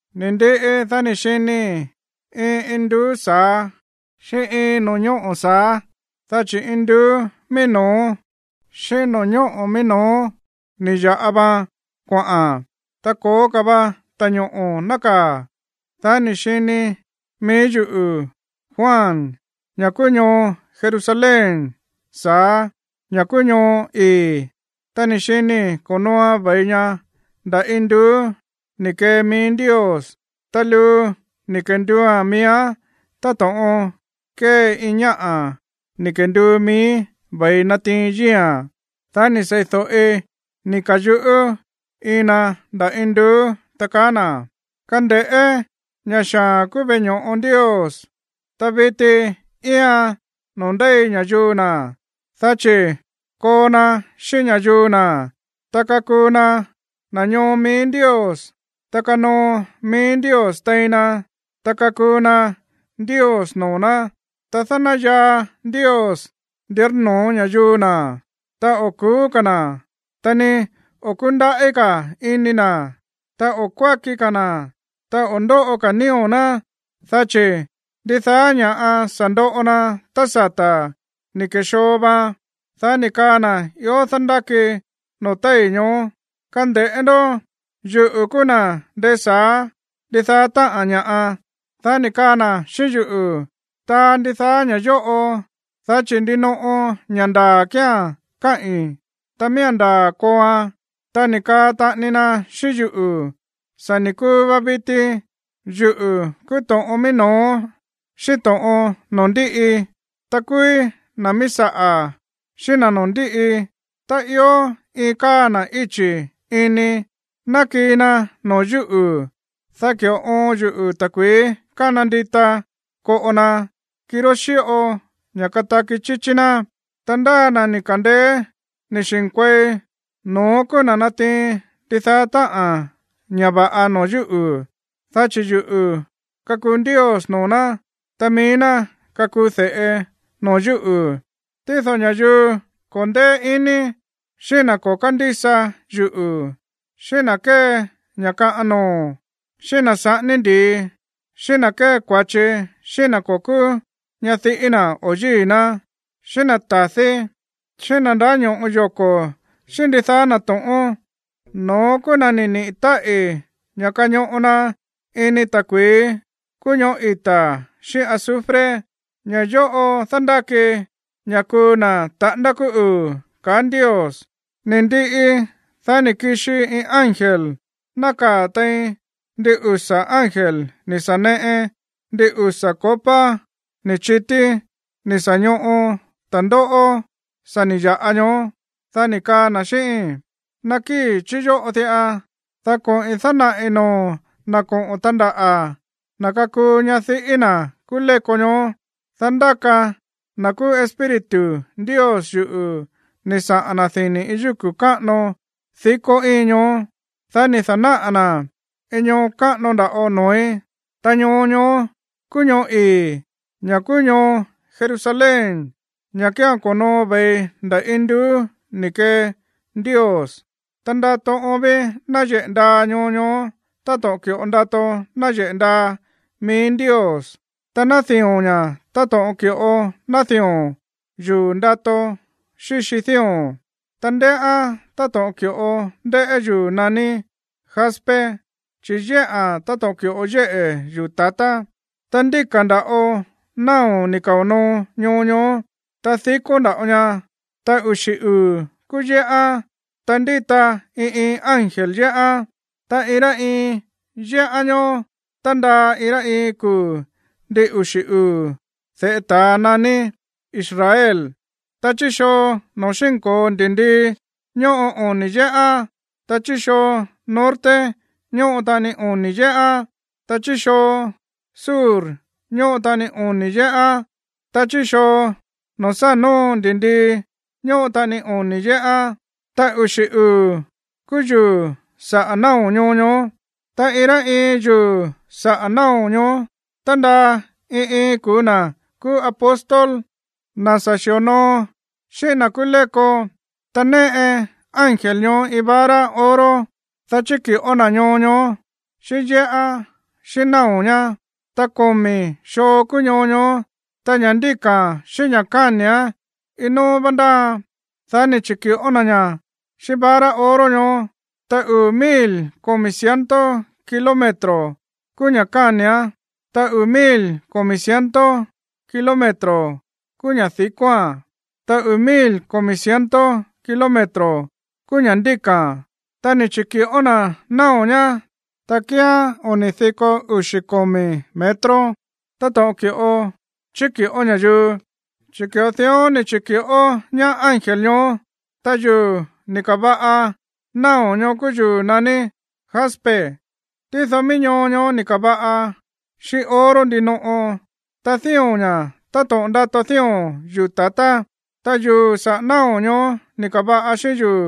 Ni̱ ndiꞌi, dá ni̱ xinii̱ iin induú sa̱á xíꞌín iin no̱ñóꞌo̱ sa̱á, dá chi̱ induú mií no̱ó xíꞌín no̱ñóꞌo̱ mií no̱ó ni̱ ya̱ꞌa vaan kuaꞌa̱n, ta ko̱ó ka̱ va ta̱ñoꞌo̱ nákaa̱. Dá ni̱ xini mií yuꞌu̱, Juan, ña̱ kúú ñoo Jerusalén sa̱á, ña̱ kúú ñoo ii̱. Ta ni̱ xinii̱ ko̱nooan ve̱i ña nda̱ induú ni̱ kee mií Ndios, ta luu ni̱ kenduua̱n miíán táto̱ꞌon kée iin ñáꞌa̱ ni̱ kenduu mií ve̱i natiin yíi̱a̱n. Dá ni̱ sei̱do̱ꞌi ni̱ ka̱yuꞌú iin na nda̱ induú, ta kaá na̱: ―Kande̱ꞌé, ña̱ xaa̱n kúú veꞌe ño̱ꞌo Ndios, ta viti íian noo̱ ndéi ña̱yuu na̱, dá chi̱ koo na xíꞌín ña̱yuu na̱, ta kakuu na na̱ ñoo mií Ndios, ta kanoo mií Ndios tein na, ta kakuu na Ndios noo̱ ná. Ta dánayaa Ndios ndírnoo̱ ña̱yuu na̱. Ta o̱ ku̱ú ka̱ na̱, ta ni o̱ kúndaꞌí ka̱ ini na̱, ta o̱ kuáki ka̱ na̱, ta o̱ ndóꞌo ka̱ nío̱ ná, dá chi̱ ndidaá ña̱ꞌa sa̱ ndoꞌo na tá sata̱ ni̱ ke̱xoo vaan. Dá ni̱ kaa na̱ ió dándáki noo̱ téi̱ ñoó: ―Kande̱ꞌé ndó, yuꞌu̱ kúú na̱ ndésa̱á ndidaá táꞌa̱n ña̱ꞌa. Dá ni̱ kaa na̱ xíꞌín yuꞌu̱: ―Taa ndidaá ña̱ yóꞌo, dá chi̱ ndinoꞌo ña̱ ndaa̱ kía̱n káꞌi̱n, ta miía̱n ndaa̱ kooan. Ta ni̱ kaa taꞌani na xíꞌín yuꞌu̱: ―Sa̱ ni̱ kuu va viti. Yuꞌu̱ kúú to̱ꞌon mií no̱ó xíꞌín to̱ꞌon noo̱ ndíꞌi, ta kúúí na̱ míí saꞌa̱ xíꞌín na̱ noo̱ ndíꞌi. Tá ió iin káa na̱ íchi̱ ini, nakíi̱ na̱ no̱ó yuꞌu̱, dá ki̱ꞌo oon yuꞌu̱ ta̱kui̱í kána ndita koꞌo na, kirá xíꞌo ña̱ kataki chíchí ná. Ta ndi ndáa na̱ ni̱ ka̱ndeé ni̱ xi̱nkuei, no̱ón kúú na̱ natiin ndidaá táꞌa̱n ña̱ va̱ꞌa no̱ó yuꞌu̱, dá chi̱ yuꞌu̱ kakuu Ndios noo̱ ná, ta mií ná kakuu de̱ꞌe no̱ó yuꞌu̱. Tído ña̱yuu ko̱ ndéé iní, xíꞌín na̱ ko̱ kándísa yuꞌu̱, xíꞌín na̱ kée ña̱ kaꞌan noo̱, xíꞌín na̱ saꞌání ndi̱i, xíꞌín na̱ kée kua̱chi xíꞌín na̱ ko̱ kúú ñadiꞌí na̱ o yíi̱ ná, xíꞌín na̱ ta̱dí, xíꞌín na̱ ndáño̱ꞌo yoko̱ xíꞌín ndidaá na̱ to̱ꞌón, no̱ón kúú na̱ ni̱ niꞌi̱ táꞌi̱ ña̱ kañoꞌo na ini ta̱kui̱í kúú ñoꞌó ita̱ xíꞌín azufre. Ña̱ yóꞌo dándáki ña̱ kuu na̱ taꞌándá kúú uu̱ ―kaá Ndios. Ni̱ ndiꞌi, dá ni̱ kixi iin ángel nákaa̱ tein ndin usa̱ ángel ni̱ sa̱ neꞌe ndin usa̱ copa ni̱ chití ni̱ sa̱ ñoꞌo ta̱ndóꞌó sa̱ ni̱ ya̱ꞌa ñoó, dá ni̱ kaa na̱ xíꞌíín: ―Nakíi̱ chí yóꞌo diꞌa, dá koꞌi̱n dánaꞌi̱ noo̱o̱n na̱ koꞌo̱n tandaꞌa̱, na̱ kakuu ñadiꞌí na̱ kúú léko ñoó. Dá ndáka na̱ kúú Espíritu Ndios yuꞌu̱ ni̱ saꞌa̱n na̱ dini̱ iin yúku̱ káꞌano dikó íin ñoó, dá ni̱ da̱náꞌa̱ na̱ iin ñoo káꞌano nda̱ꞌo noo̱í, ta ñoo ñoó kúú ñoo ii̱, ña̱ kúú ñoo Jerusalén, ña̱ kía̱n ko̱noo ve̱i nda̱ induú ni̱ kee Ndios. Ta ndato oon ví náyeꞌe̱ ndaa ñoo ñoó táto̱ꞌon ki̱ꞌo ndato náyeꞌe̱ ndaa mií Ndios. Ta nádío̱n ña̱ táto̱ꞌon ki̱ꞌo nádío̱n yuu̱ ndato xíxi dío̱n, ta ndéꞌán táto̱ꞌon ki̱ꞌo ndéꞌé yuu̱ naní jaspe, chi̱ yéꞌa̱n táto̱ꞌon ki̱ꞌo yéꞌe̱ yuu̱ ta̱tá. Ta ndíka̱ nda̱ꞌo náo̱ ni̱ kao̱ noo ñoo ñoó, ta dikó nda̱ꞌo ña, ta uxi̱ uu̱ kúú yéꞌán, ta ndíta iin iin ángel yéꞌán, ta iin rá iin yéꞌán ñoó tándaa iin rá iin kuu̱ ndin uxi̱ uu̱ de̱ꞌe ta̱a naní Israel. Ta chí xoo noo̱ xínko̱o ndi̱ndii ñóꞌo oni̱ yéꞌán, ta chí xoo norte ñóꞌo taꞌani oni̱ yéꞌán, ta chí xoo sur ñóꞌo taꞌani oni̱ yéꞌán, ta chí xoo noo̱ sá nóo ndi̱ndii ñóꞌo taꞌani oni̱ yéꞌán. Ta uxi̱ uu̱ kúú yuu̱ saꞌa̱ náo̱ ñoo ñoó, ta iin rá iin yuu̱ saꞌa̱ náo̱ ñoó tándaa iin iin kuu̱ na̱ kúú apóstol, na̱ sa̱ xi̱onoo xíꞌín na̱ kúú léko. Ta néꞌe ángel ñoó iin vara oro, dá chiki̱ꞌó na̱ ñoo ñoó, xíꞌín yéꞌán xíꞌín náo̱ ñá. Ta komi̱ xoo kúú ñoo ñoó, ta ña̱ ndíka̱a̱n xíꞌín ña̱ káni̱án, iin nóó vá ndáaan. Dá ni̱ chi̱ki̱ꞌó na̱ ñá xíꞌín vara oro ñoó, ta uu̱ mil komi̱ ciento kilómetro kúú ña̱ káni̱án, ta uu̱ mil komi̱ ciento kilómetro kúú ña̱ di̱kóa̱n, ta uu̱ mil komi̱ ciento kilómetro kúú ña̱ ndíka̱a̱n. Ta ni̱ chi̱ki̱ꞌó na̱ náo̱ ñá, ta kíán oni̱ diko uxi̱ komi̱ metro táto̱ꞌon ki̱ꞌo chíki̱ꞌó ña̱yuu, chi̱ ki̱ꞌo dión ni̱ chi̱ki̱ꞌó ñaá ángel ñoó. Ta yuu̱ ni̱ ka̱va̱ꞌa náo̱ ñoó kúú yuu̱ naní jaspe. Tído mií ñoo ñoó ni̱ ka̱va̱ꞌa xíꞌín oro ndinoꞌo, ta dío̱n ña̱ táto̱ꞌon ndato dío̱n yuu̱ ta̱tá. Ta yuu̱ saꞌa̱ náo̱ ñoó ni̱ ka̱va̱ꞌa xíꞌín yuu̱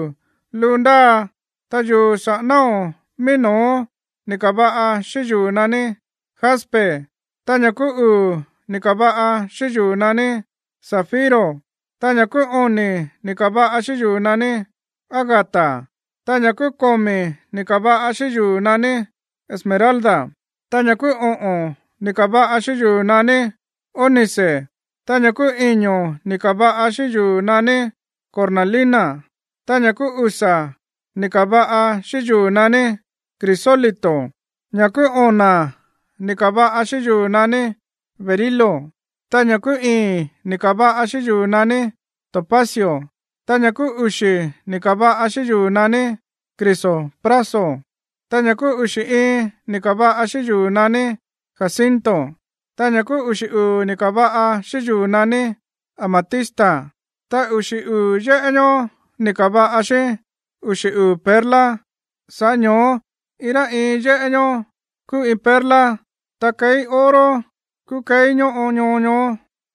luu ndáa, ta yuu̱ saꞌa̱ náo̱ mií no̱ó ni̱ ka̱va̱ꞌa xíꞌín yuu̱ naní jaspe, ta ña̱ kúú uu̱ ni̱ ka̱va̱ꞌa xíꞌín yuu̱ naní zafiro, ta ña̱ kúú oni̱ ni̱ ka̱va̱ꞌa xíꞌín yuu̱ naní ágata, ta ña̱ kúú komi̱ ni̱ ka̱va̱ꞌa xíꞌín yuu̱ naní esmeralda, ta ña̱ kúú oꞌo̱n ni̱ ka̱va̱ꞌa xíꞌín yuu̱ naní ónice, ta ña̱ kúú iño̱ ni̱ ka̱va̱ꞌa xíꞌín yuu̱ naní cornalina, ta ña̱ kúú usa̱ ni̱ ka̱va̱ꞌa xíꞌín yuu̱ naní crisólito, ta ña̱ kúú ona̱ ni̱ ka̱va̱ꞌa xíꞌín yuu̱ naní berilo, ta ña̱ kúú ii̱n ni̱ ka̱va̱ꞌa xíꞌín yuu̱ naní topacio, ta ña̱ kúú uxi̱ ni̱ ka̱va̱ꞌa xíꞌín yuu̱ naní crisopraso, ta ña̱ kúú uxi̱ iin ni̱ ka̱va̱ꞌa xíꞌín yuu̱ naní jacinto, ta ña̱ kúú uxi̱ uu̱ ni̱ ka̱va̱ꞌa xíꞌín yuu̱ naní amatista. Ta uxi̱ uu̱ yéꞌé ñoó ni̱ ka̱va̱ꞌa xíꞌín uxi̱ uu̱ perla, sa̱ꞌá ño̱ó iin rá iin yéꞌé ñoó kúú iin perla. Ta keí oro kúú keí ñóꞌo ñoo ñoó,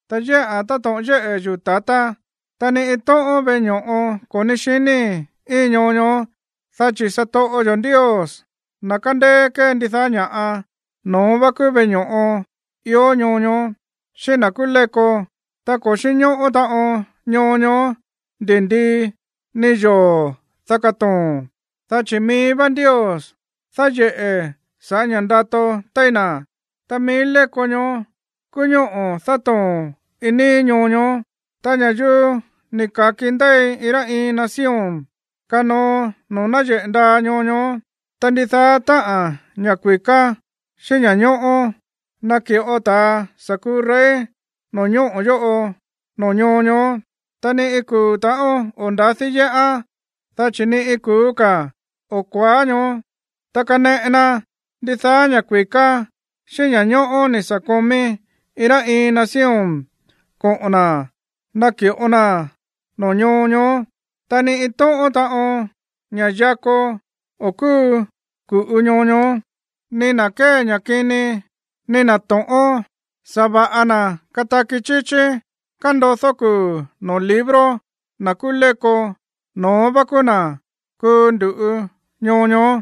ta yéꞌa̱n táto̱ꞌon yéꞌe̱ yuu̱ ta̱tá. Ta ni iin tóꞌón veꞌe ño̱ꞌo ko̱ ní xiníi̱ íin ñoo ñoó, dá chi̱ satoꞌo yo̱ Ndios, na̱ kándéé kée ndidaá ña̱ꞌa, no̱ón vá kúú veꞌe ño̱ꞌo ió ñoo ñoó, xíꞌín na̱ kúú léko. Ta ko̱ xínñóꞌó taꞌon ñoo ñoó ndi̱ndii, ni yoo̱, dá katoo̱n, dá chi̱ mií vá Ndios dáyeꞌe̱ sa̱ꞌá ña̱ ndato téí na̱, ta mií léko ñoó kúú ñóꞌo̱ dátoo̱n iin níí ñoo ñoó. Ta ña̱yuu ni̱ ka̱ki ndéi iin rá iin nación kanoo noo̱ náyeꞌe̱ ndaa ñoo ñoó, ta ndidaá táꞌa̱n ña̱ kui̱ká xíꞌín ña̱ñóꞌó naki̱ꞌo ta̱ sa̱ kuu rey no̱ñóꞌo̱ yóꞌo noo̱ ñoo ñoó. Ta ni iin kuu̱ ta̱ꞌón o̱ nda̱dí yéꞌán, dá chi̱ ni iin kuu̱ ka̱ o̱ kuaá ñoó. Ta kaneꞌe na ndidaá ña̱ kui̱ká xíꞌín ña̱ñóꞌó ni̱ sa̱ komí iin rá iin nación koꞌo̱n na̱ naki̱ꞌo naa̱n noo̱ ñoo ñoó. Ta ni iin tóꞌón taꞌon ña̱ yakó o̱ kúu ku̱ꞌu ñoo ñoó, ni na̱ kée ña̱ kini, ni na̱ to̱ꞌón. Sa̱va̱ꞌa na̱ kataki chíchí kándodó kuu̱ noo̱ libro na̱ kúú léko, no̱ón vá kúú na̱ kuu ndu̱ꞌu ñoo ñoó.